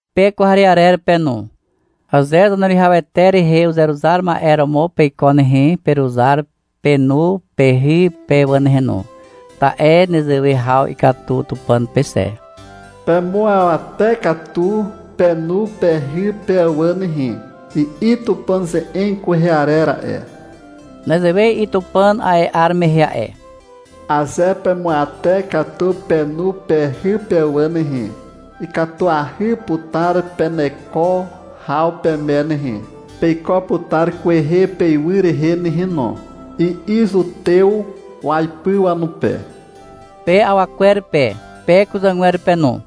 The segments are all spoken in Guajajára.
Pe kwarearer pe no. Aze Zaneruwihawete rehe uzeruzar ma'e romo peiko nehe, peruzar penu pehy pe wà nehe no, ta'e nezewe haw ikatu Tupàn pe xe. — Pemuawate katu penu pehy pe wà nehe, i'i Tupàn ze'eg kwehe arer a'e. Nezewe i'i Tupàn a'e 'ar mehe a'e. — Aze pemuawate katu penu pehy pe wà nehe, ikatuahy putar peneko haw peme nehe, peiko putar kwehe peywy rehe nehe no, i'i zutew waipy wanupe. Pe awa kwer pe, pe kuzàgwer pe no.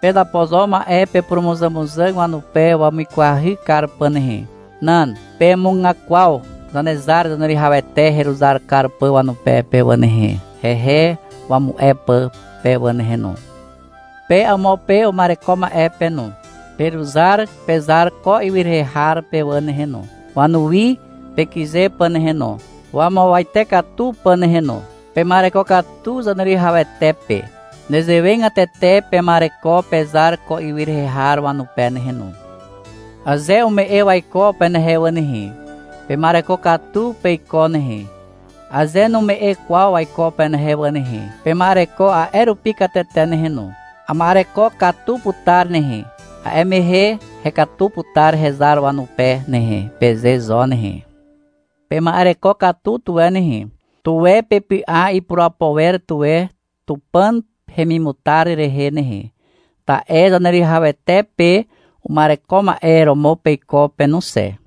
Pezapo zo ma'e pepurumuzàmuzàg wanupe wamuikwahy kar pà nehe. Nan. Pemugakwaw Zanezar Zaneruwihawete heruzar kar pà wanupe pe wà nehe, hehe wamu'e pà pe wà nehe no. Pe amo pe uma'ereko ma'e pe no. Peruzar pezar ko ywy rehe har pe wà nehe no, wanuwi pekyze pà nehe no, wamuawate katu pà nehe no. Pema'ereko katu Zaneruwihawete pe. Nezewegatete pema'ereko pezar ko ywy rehe har wanupe nehe no. Aze ume'e waiko penehe wà nehe, pema'ereko katu peiko nehe. Aze nume'e kwaw waiko penehe wà nehe, pema'ereko a'e rupi katete nehe no. — Ama'ereko katu putar nehe. A'e mehe hekatu putar hezar wanupe nehe, peze zo nehe. Pema'ereko katu tuwe nehe. Tuwe pepy'a ipurapo wer tuwe Tupàn hemimutar rehe nehe, ta'e Zaneruwihawete pe uma'ereko ma'e romo peiko pe no xe.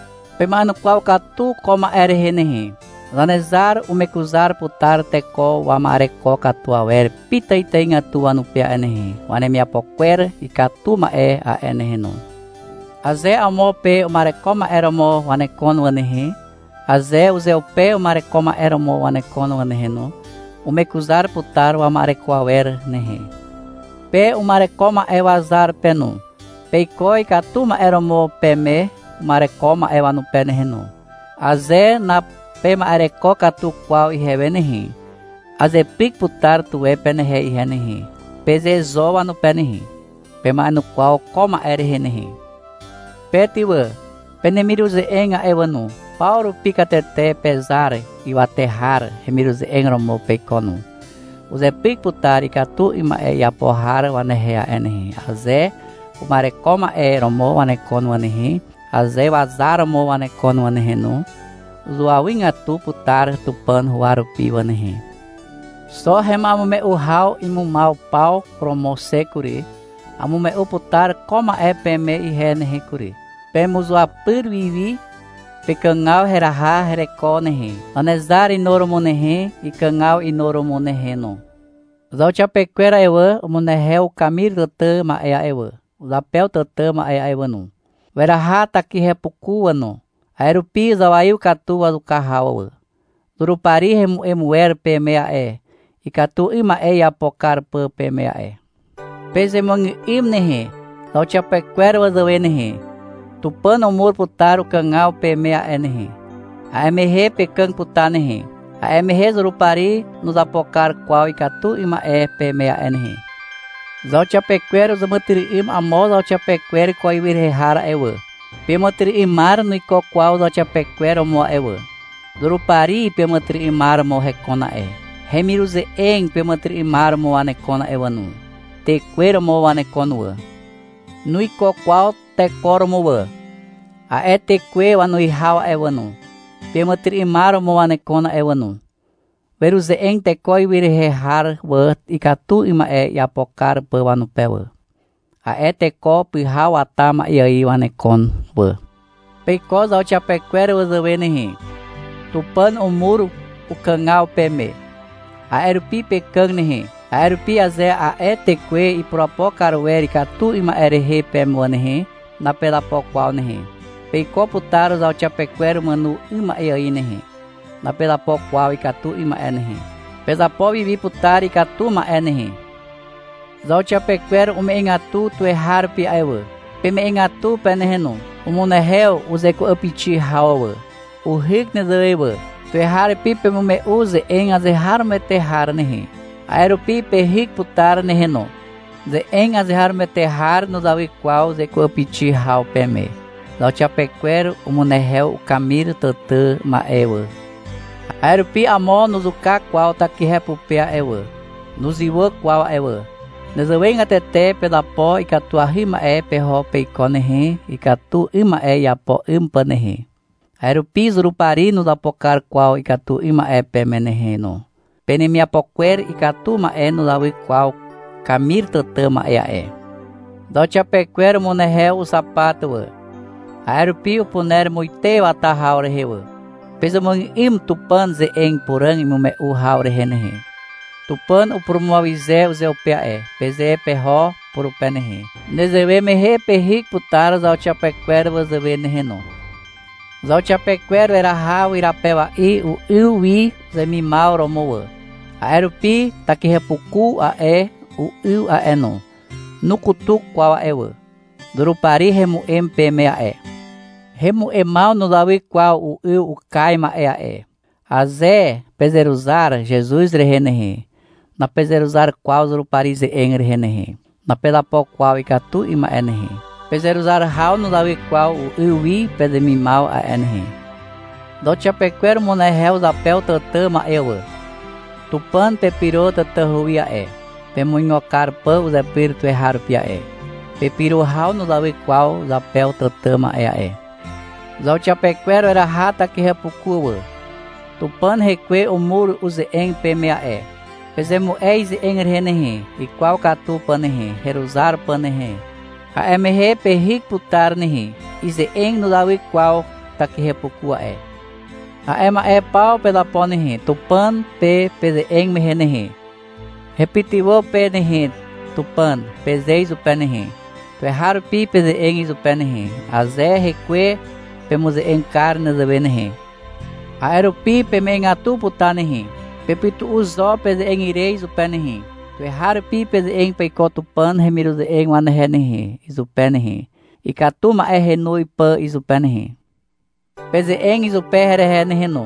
Pema'enukwaw katu ko ma'e rehe nehe. Zanezar umekuzar putar teko wama'ereko katu awer pitàitàigatu wanupe a'e nehe, wanemiapo kwer ikatu ma'e a'e nehe no. Aze amo pe uma'ereko ma'e romo wanekon wà nehe, aze uzeupe uma'ereko ma'e romo wanekon wà nehe no, umekuzar putar wama'ereko awer nehe. Pe uma'ereko ma'e wazar pe no, peiko ikatu ma'e romo peme uma'ereko ma'e wanupe nehe no. — Aze napema'ereko katu kwaw ihewe nehe, azepyk putar tuwe penehe ihe nehe, peze zo wanupe nehe. Pema'enukwaw ko ma'e rehe nehe. Pe ty wà, penemiruze'eg a'e wà no, paw rupi katete pezar ywate har hemiruze'eg romo peiko no. Uzepyk putar ikatu 'ym ma'e iapo har wanehe a'e nehe, aze uma'ereko ma'e romo wanekon wà nehe, aze wazar romo wanekon wà nehe no. Zuawygatu putar Tupàn huwa rupi wà nehe. Xo hema'emume'u haw imumaw paw romo xe kury. Amume'u putar ko ma'e peme ihe nehe kury. Pemuzuapyr wiwi pekàgaw heraha hereko nehe, Zanezar inuromo nehe, ikàgaw inuromo nehe no. Zauxiapekwer a'e wà, umunehew kamir tàtà ma'e a'e wà, zapew tàtà ma'e a'e wà no. Weraha takihepuku wà no. A'e rupi zawaiw katu wazuka haw wà. Zurupari hemu'em wer peme a'e, ikatu 'ym ma'e iapo kar pà peme a'e. Pezemuàgà'ym nehe, zauxiapekwer wazàwe nehe. Tupàn umur putar ukàgaw peme a'e nehe. A'e mehe pekàg putar nehe. A'e mehe Zurupari nuzapo kar kwaw ikatu 'ym ma'e peme a'e nehe. Zauxiapekwer uzàmàtyry'ym amo zauxiapekwer ko ywy rehe har a'e wà. Peàmàtyry'ymar nuiko kwaw zauxiapekwer romo a'e wà. Zurupari peàmàtyry'ymar romo hekon a'e. Hemiruze'eg peàmàtyry'ymar romo wanekon a'e wà no. Tekwe romo wanekon wà. Nuiko kwaw teko romo wà. A'e tekwe wanuwihaw a'e wà no, peàmàtyry'ymar romo wanekon a'e wà no. Weruze'eg teko ywy rehe har wà, ikatu 'ym ma'e iapo kar pà wanupe wà. A'e teko pyhaw wata ma'e ài wanekon wà. Peiko zauxiapekwer wazàwe nehe. Tupàn umur ukàgaw peme. A'e rupi pekàg nehe. A'e rupi aze a'e tekwe ipurapo kar wer ikatu 'ym ma'e rehe peme wà nehe, napezapo kwaw nehe. Peiko putar zauxiapekwer umàno 'ym ma'e ài nehe. Napezapo kwaw ikatu 'ym ma'e nehe. Pezapo wi wi putar ikatu ma'e nehe. Zauxiapekwer ume'egatu tuweharupi a'e wà. Peme'egatu pe nehe no. Umunehew uzeku'apixi haw wà. Uhyk nezewe wà. Tuweharupi pemume'u ze'eg azeharomoete har nehe. A'e rupi pehyk putar nehe no. Ze'eg azeharomoete har nuzawy kwaw zeku'apixi haw peme. Zauxiapekwer umunehew ukamir tàtà ma'e wà. A'e rupi amo nuzuka kwaw takihe pupe a'e wà, nuzywà kwaw a'e wà. Nezewegatete pezapo ikatuahy ma'e peho peiko nehe, ikatu 'ym ma'e iapo 'ym pà nehe. A'e rupi Zurupari nuzapo kar kwaw ikatu 'ym ma'e peme nehe no. Penemiapo kwer ikatu ma'e nuzawy kwaw kamir tàtà ma'e a'e. Zauxiapekwer umunehew uxapat wà. A'e rupi upuner muite wata haw rehe wà. Pezemuàgà'ym Tupàn ze'eg puràg imume'u haw rehe nehe. — Tupàn upurumuawyze uzeupe a'e, peze peho purupe nehe. Nezewe mehe pehyk putar zauxiapekwer wazàwe nehe no. Zauxiapekwer weraha wyrapewa'i u'yw wi uzemimaw romo wà. A'e rupi takihepuku a'e, u'yw a'e no, nukutuk kwaw a'e wà. Zurupari hemu'em peme a'e. Hemu'emaw nuzawy kwaw u'yw ukaz ma'e a'e. Aze pezeruzar Zezuz rehe nehe, napezeruzar kwaw Zurupari ze'eg rehe nehe. Napezapo kwaw ikatu 'ym ma'e nehe. Pezeruzar haw nuzawy kwaw u'yw wi pezemimaw a'e nehe. Zauxiapekwer umunehew zapew tàtà ma'e wà. Tupàn pepyro tatahu wi a'e, pemuigo kar pà uzepyr tuweharupi a'e. Pepyro haw nuzawy kwaw zapew tàtà ma'e a'e. Zauxiapekwer weraha takihepuku wà. Tupàn Hekwe umur uze'eg peme a'e. Pezemu'e ize'eg rehe nehe, ikwaw katu pà nehe, heruzar pà nehe. A'e mehe pehyk putar nehe. Ize'eg nuzawy kwaw takihepuku a'e. A'e ma'e paw pezapo nehe, Tupàn pe peze'eg mehe nehe. — Hepytywà pe nehe, Tupàn, peze izupe nehe. Tuweharupi peze'eg izupe nehe, aze Hekwe pemuze'eg kar nezewe nehe. A'e rupi peme'egatu putar nehe. Pepytu'u zo peze'eg ire izupe nehe. Tuweharupi peze'eg peiko Tupàn hemiruze'eg wanehe nehe, izupe nehe, ikatu ma'e henoz pà izupe nehe. Peze'eg izupe herehe nehe no.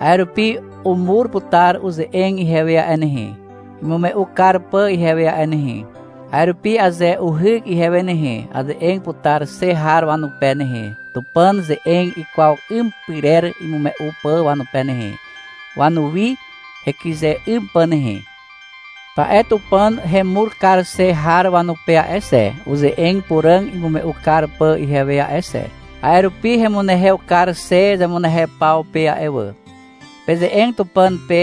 A'e rupi umur putar uze'eg ihewe a'e nehe, imume'u kar pà ihewe a'e nehe. A'e rupi aze uhyk ihewe nehe, aze'eg putar xe har wanupe nehe, Tupàn ze'eg ikwaw 'ym pyrer imume'u pà wanupe nehe, wanuwi hekyze 'ym pà nehe. Ta'e Tupàn hemur kar xe har wanupe a'e xe, uze'eg puràg imume'u kar pà ihewe a'e xe. A'e rupi hemunehew kar xe zemunehew paw pe a'e wà. Peze'eg Tupàn pe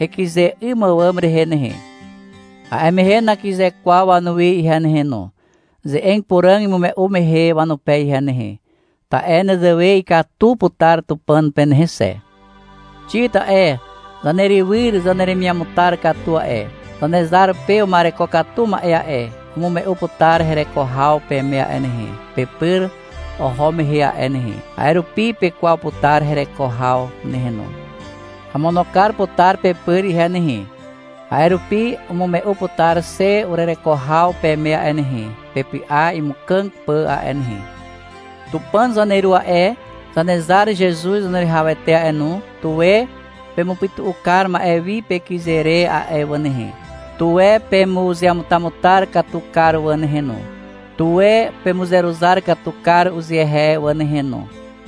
hekyze 'ym àwàm rehe nehe. A'e mehe nakyze kwaw wanuwi ihe nehe no, ze'eg puràg imume'u mehe wanupe ihe nehe. Ta'e nezewe ikatu putar Tupàn pe nehe xe. Xik a'e, zanerywyr zaneremiamutar katu a'e, Zanezar pe uma'ereko katu ma'e a'e, umume'u putar hereko haw peme a'e nehe, pepyr oho mehe a'e nehe. A'e rupi pekwaw putar hereko haw nehe no. Amono kar putar pepyr ihe nehe. A'e rupi umume'u putar xe urereko haw peme a'e nehe, pepy'a imukàg pà a'e nehe. Tupàn zaneru a'e, Zanezar Zezuz Zaneruwihawete a'e no, tuwe pemupytu'u kar ma'e wi pekyze re a'e wà nehe. Tuwe pemuzeamutamutar katu kar wà nehe no. Tuwe pemuzeruzar katu kar uzehe wà nehe no.